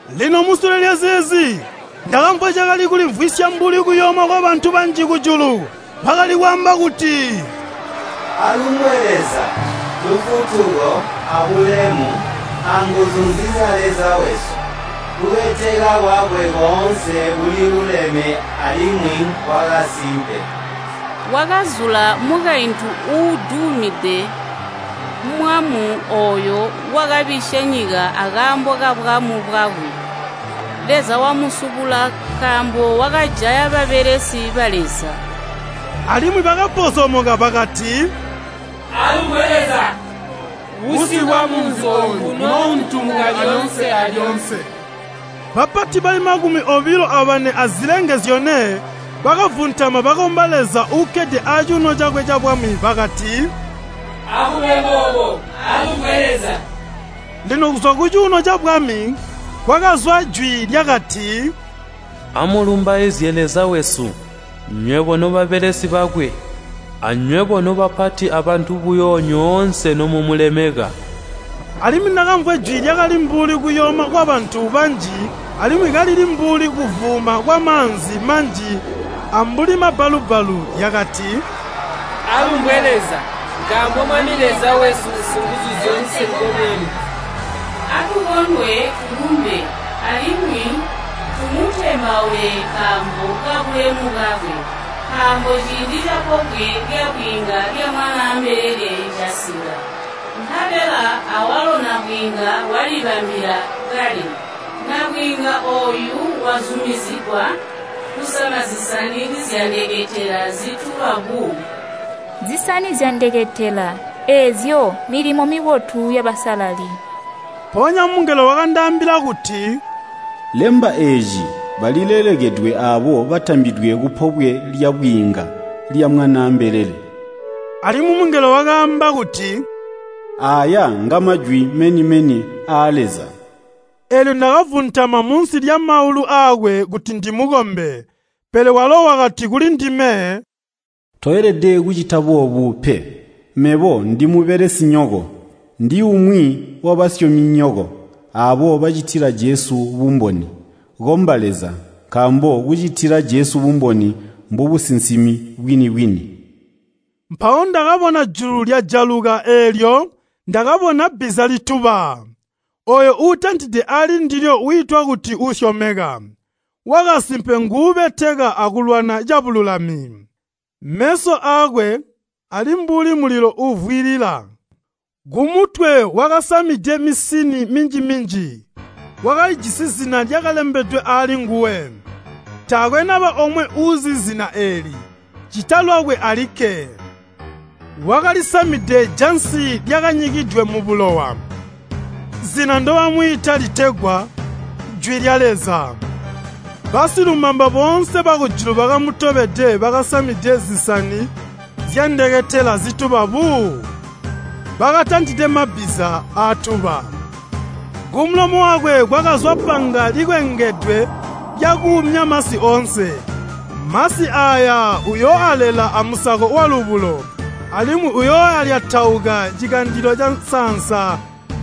Lino musule lyazeezi, ndakamvwa cakali kulimvwisya mbuli kuyooma kwabantu banji kujulu, bakali kwaamba kuti, “Alumbwe Leza! Lufutuko abulemu anguzu nzizya Leza wesu! Kubeteka kwakwe koonse kuliluleme alimwi nkwakasimpe! Wakazula mukaintu uudumide mwaamu ooyo wakabisya nyika akaambo kabwaamu bwakwe. Leza wamusubula nkaambo wakajaya babelesi ba Leza.” Alimwi bakapozomoka bakati, “Alumbwe Leza! Busi bwamunzi ooyu bunoountumuka lyoonse alyoonse!” Bapati bali makumi obilo abane azilenge zyone bakavuntama bakomba Leza uukkede acuuno cakwe cabwami. Bakati, “Akube boobo! Alumbwe Leza!” Lino kuzwa kucuuno cabwami, kwakazwa jwi lyakati, “Amulumbaizye Leza wesu, nywebo nobabelesi bakwe, anywebo nobapati abantu buyo nyoonse nomumulemeka!” Alimwi ndakamvwa jwi lyakali mbuli kuyooma kwabantu banji alimwi kalili mbuli kuvuuma kwamaanzi manji ambuli mabbalu-bbalu, lyakati, “Alumbwe Leza, nkaambo Mwami Leza wesu Singuzuzyoonse ngo Mwami! Atukondwe tulumbe, alimwi tumutembaule nkaambo kabulemu bwakwe! Nkaambo ciindi capobwe lyabwiinga lya Mwanaa mbelele casika, nkabela awalo nabwiinga walibambila kale. Nabwiinga ooyu wazumizigwa kusama zisani zyandeketela zituba buu.” (Zisani zyandeketela, eezyo mmilimo mibotu yabasalali.) Mpoonya mungelo wakandaambila kuti, “Lemba eeci, balilelekedwe aabo batambidwe kupobwe lyabwiinga lya Mwanaa mbelele.” Alimwi mungelo wakaamba kuti, “Aaya ngamajwi meni-meni aa Leza.” Eelyo ndakavuntama munsi lyamaulu aakwe kuti ndimukombe, pele walo wakati kulindime, “Toelede kucita boobu pe! Mebo ndimubelesinyoko, ndiumwi wabasyominyoko, aabo bacitila Jesu bumboni. Komba Leza!” Nkaambo kucitila Jesu bumboni mbobusinsimi bwini-bwini. Mpawo ndakabona julu lyajaluka, eelyo ndakabona bbiza lituba! Ooyo uutantide ali ndilyo wiitwa kuti Uusyomeka, Wakasimpe nguubeteka akulwana cabululami. Meso aakwe ali mbuli mulilo uuvwilila. Kumutwe wakasamide misini minji-minji. Wakalijisi zina lyakalembedwe alinguwe, taakwe naba omwe uuzi zina eeli, ccita lwakwe alikke. Wakalisamide jansi lyakanyikidwe mubulowa, zina ndobamwiita litegwa “Jwi lya Leza.” Basilumamba boonse bakujulu bakamutobede bakasamide zisani zyandeketela zituba buu, bakatantide amabbiza aatuba. Kumulomo wakwe kwakazwa panga likwengedwe lyakuumya masi oonse. Masi aaya uyooalela amusako walubulo, alimwi uyoolyatauka cikandilo cansaansa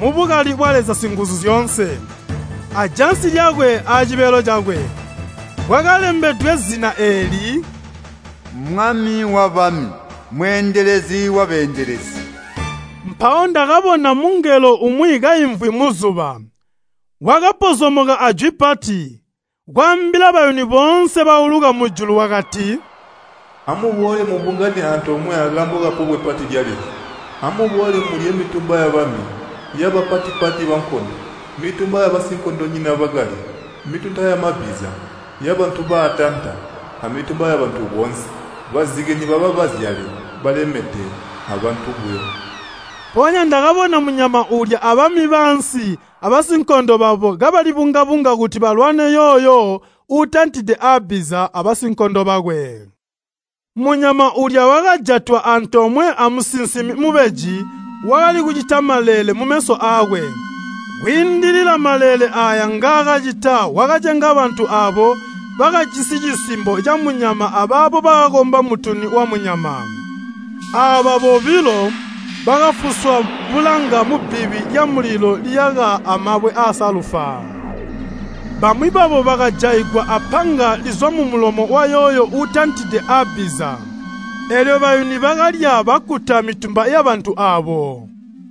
mubukali bwa Leza Singuzuzyoonse. Ajansi lyakwe aacibelo cakwe, kwakalembedwe zina eeli, “Mwami wabami, Mweendelezi wabeendelezi.” Mpawo ndakabona mungelo umwi kaimvwi muzuba. Wakapozomoka ajwi pati, kwaambila bayuni boonse bauluka mujulu wakati, “Amuboole mubungane antoomwe akaambo kapobwe pati lya Leza. Amuboole mulye, mitumba yabami, yabapati-pati bankondo, mitumba yabasinkondonyina bakali, mitunta yamabbiza, yabantu baatanta, amitumba yabantu boonse, bazike nibaba bazyale balemede abantu buyo.” Mpoonya ndakabona munyama uulya abami baansi abasinkondo babo kabalibunga-bunga kuti balwane yooyo uutantide abbiza abasinkondo bakwe. Munyama uulya wakajatwa antoomwe amusinsimi mubeji wakali kucita maleele mumeso aakwe. Kwiindila mumaleele aaya ngaakacita wakacenga bantu aabo bakajisi cisimbo camunyama abaabo bakakomba mutuni wamunyama. Aaba bobilo bakafuswa bulanga mubbibi lyamulilo liyaka amabwe aasalufa. Bamwi babo bakajaigwa apanga lizwa mumulomo wayooyo uutantide abbiza, eelyo bayuni bakalya bakkuta mitumba yabantu aabo.